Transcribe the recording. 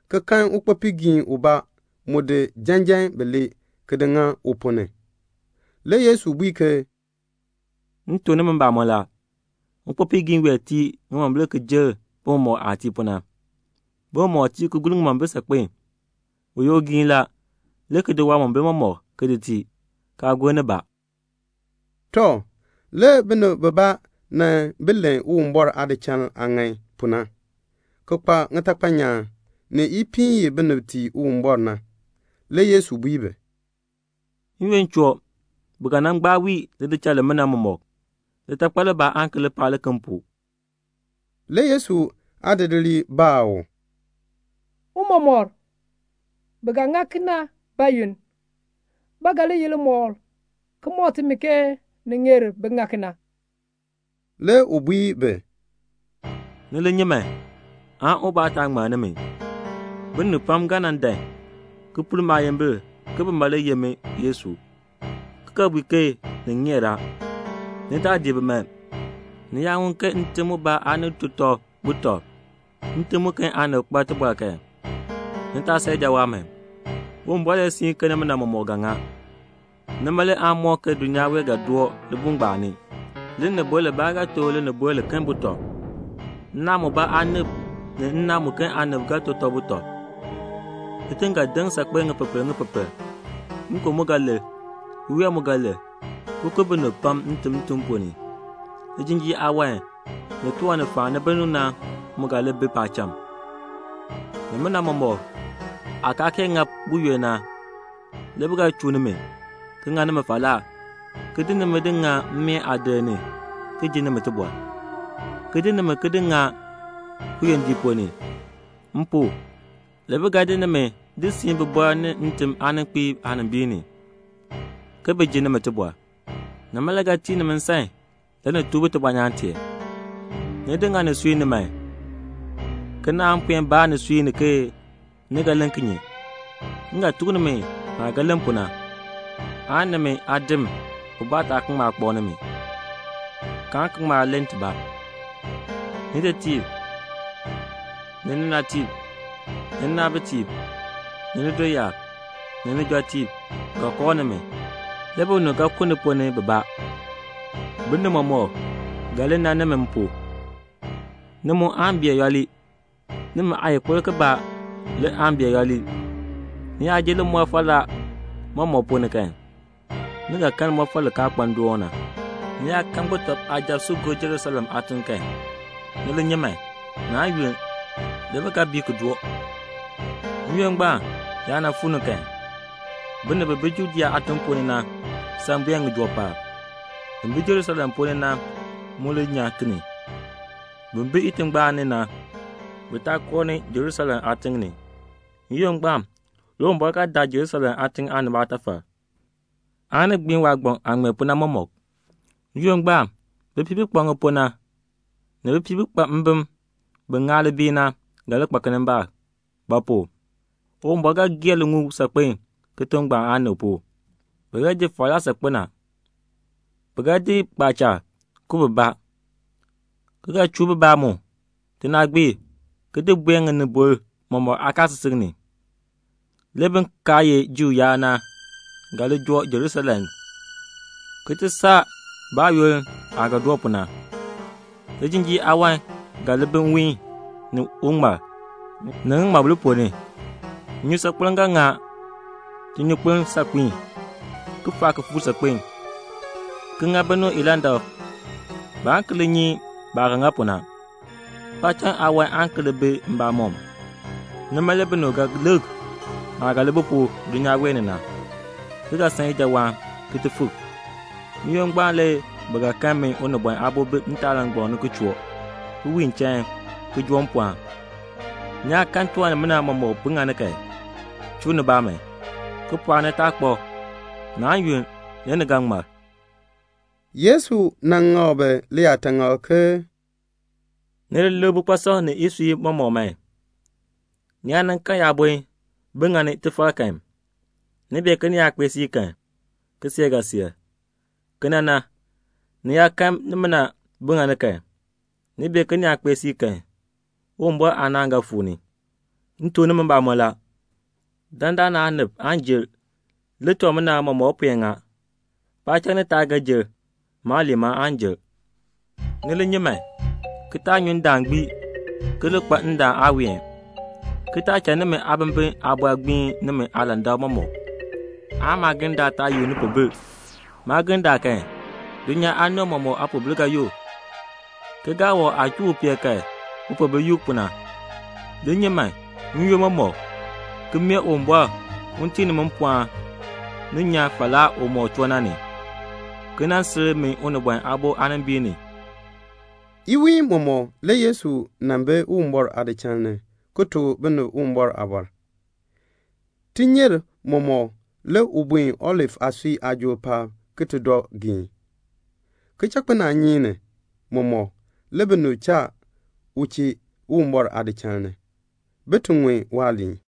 ki kan ukpopiigiin ubaa mu di janjan mam bilee ki di ŋa u ponn ni. Le Yesu bui ke "M tuk nimi mbamɔn la, ukpopiigiin wee tii ŋimombil ki jer bi mɔmɔk aah tii pu na. Bi mɔmɔk tii ki gur ŋimombil saakpen. U ye ugiin la, le ki di waamombil mɔmɔk ki di tii, kaa ki gur nibaa." Tɔ, le binib bibaa nan bi len Uwumbɔr aadichal aah ŋan pu na, ki kpa ŋitakpal nyaan, ni ipiin i binib tii Uwumbɔr na. Le Yesu bui bi, "N-yoonn choo, bi ga nan gbaa wii lidichal limina mɔmɔk. Litakpal libaa aan ki li paa liken pu." Le Yesu aadidiliib baa u, "Tiicha, bi ga ŋa kena bayoonn? Ba ga li ye limɔkl ki mɔk timi ke ni ŋeer bin ŋa kena?" Le u bui bi, "Ni li nyi man, ubaa taa ŋmann nimi. Binib pam le ga nan dan ki pur maayimbil ke bima le ye min Yesu, ki ga bui ke ni ŋeer a. Ni taa dii bi man. Ni yaa ŋun ke ntim mubaa aanib to butɔb, ntim muken aanib kpa tibɔr kan, ni taa san ijawaan man. Uwumbɔr le siin ke nimina mɔmɔk ga ŋa. Nima le aan mɔk ke dulnyaa wee ga doo libuul ngbaan ni. "Linibol libaa ga to linibol liken butɔb. Nnaan mubaa aanib ni nnaan muken aanib ga to tɔb butɔb. Kitiŋ ga deŋ saakpen ŋipepel ŋipepel. Nkon mu ga lir. Iween mu ga lir, ki ku binib pam ntim ntim ponn ni. Lijinjiir aawan, ni tiwan ni faani binib na mu ga li bi paacham. "Nimina mɔmɔk aa kaa kee ŋa buyoonn na, le bi ga chuu nimi, ki ŋa nimi falaa, ki di nimi di ŋa mmeen aadir ni ki ji nimi tibɔr, ki di nimi ki di ŋa kiyondiik ponn ni. M pu, le bi ga di nimi di siin bibɔrb ni ntim aaninkpiib aanimbiin ni, bin ti ji nimi tibɔr. Nima le ga tii nimi nsan le ni tuk bi tibɔnyaan tee. Ni di ŋa nisui ni man ke naan puen baa nisui ni ke ni ga len kinye? M ga tuk nimi naah ga ti len pu na, aan nimi aadin ubaa taa ki ŋma kpak nimi, kaan ki ŋma len tibaa. Nitetiib, ni ninatiib, ni ninaabitiib, ni nidoyaab, ni nijɔtiib, ga kooh nimi. Le binib ga ku ni ponn ni bibaa. Binib mɔmɔk ga li nan nimi m pu. Ni mu aan bee yooli; nimi aayikpirk kibaa le aan bee yooli. Ni yaa ji limɔr falaa mɔmɔk ponn ni kan, ni ga kan limɔfal li kaa kpa ndoon na la." "Ni yaa kan sujatiib si gob Jerusalem aatiŋ kan, ni li nyi man, naan yunn, le bi ga bii ki doo. N-yoonn ngbaan yaa nan fuu ni kan, bin bi Judea aatiŋ ponn ni na, bin san buen ŋijoo paab. Bin bi Jerusalem ponn ni na mu li nyan ki ni. Bin bi itingbaan ni na, bi taa koo Jerusalem aatiŋ ni. N-yoonn ngbaan le Uwumbɔr ga daa Jerusalem aatiŋ aanib aatafal, aan ki gbiin waagbaŋ aah ŋmee pu na mɔmɔk. N-yoonn ngbaan bipiib bi kpa ŋipuu na, ni bipiib bi kpa mbim bi ŋaa libiil na, bi ga li kpa kinimbaak; ba pu? Uwumbɔr ga gee liŋuul saakpen kitiŋ ngbaan aanib pu. Bi ga ji falaa saakpen a. Bi ga ku bibaa kpaacha, ki ga chuu bibaa mu tinaagbiir ki di buen ŋinibol mɔmɔk aakaasisik ni. Le bin kaa ye Juu yaab na ga li joo Jerusalem ki ti saa baayoonn aah ga doo pu na." "Lijinjiir aawan ga li bi nwiin, ni uŋmal, ni ŋiŋmabil ponn ni. Nnyusaakpem ga ŋa tinyunkpeln saakpiin, ki faa kifuuk saakpen, ki ŋa binib ilandak. Baan ki li nyi baah ga ŋa pu na. Paacham aawan aan ki li bi mbamɔm. Nima le binib ga lik naah ga li bi pu dulnyaa wee ni na, ki ga san ijawaan ki ti fik. N-yoonn ngbaan le bi ga kan min Unibɔn Aabo bi kitaalangbaŋ ni ki choo, ki wiin chain, ki joo mpɔɔn. Ni yaa kan tiwan nimina mɔmɔk bi ŋani kan, chuu nibaa man, ki pɔɔk nitaakpab. Naan yunn le ni ga ŋmar." Le Yesu ŋak bi liyaataŋakl, "Ni lik bikpasɔm ni isui mɔmɔk man. Ni yaa kan yaabon bi ŋani tifar kan, ni bee ke ni kpee siib na kan, kiseek ga seer. Kena na, ni yaa kan nimina bi ŋani kan, ni bee ke ni kpee siib na kan, Uwumbɔr aanaan ga fuu ni. "M tuk nimi mbamɔn la, dandana aanib aan jer le tiwan nimina mɔmɔk puen ŋa. Paacham ni taab ga jer. Maaliin ma aan jer." "Ni li nyi man, ki taa nyu ndaan gbii ki li kpa ndaan aaween, ki taa cha nimi aabimbin aabɔr gbiin nimi aalandak mɔmɔk, aan maagirndaal taa yuk nipoobil. Maagirndaal kan, dulnyaa aanib mɔmɔk aapoobil ga yuk, ke gaawɔb aah chuu upeel kan upoobil yuk pu na. Li nyi man n-yoonn mɔmɔk, ki mee Uwumbɔr un tii nimi mpɔɔn ni nyan falaa umɔk choo na ni, ki sil min Unibɔn Aabo aanimbiin ni." Iwiin mɔmɔk le Yesu nan bi Uwumbɔr aadichal ni, ki tuk binib Uwumbɔr aaliin. Tinyer mɔmɔk le u buen Olif aasui aajool paab ki ti dɔ geen. Kichakpinaanyeek ni mɔmɔk le binib cha u chee Uwumbɔr aadichal ni, bin ti ŋun waaliin.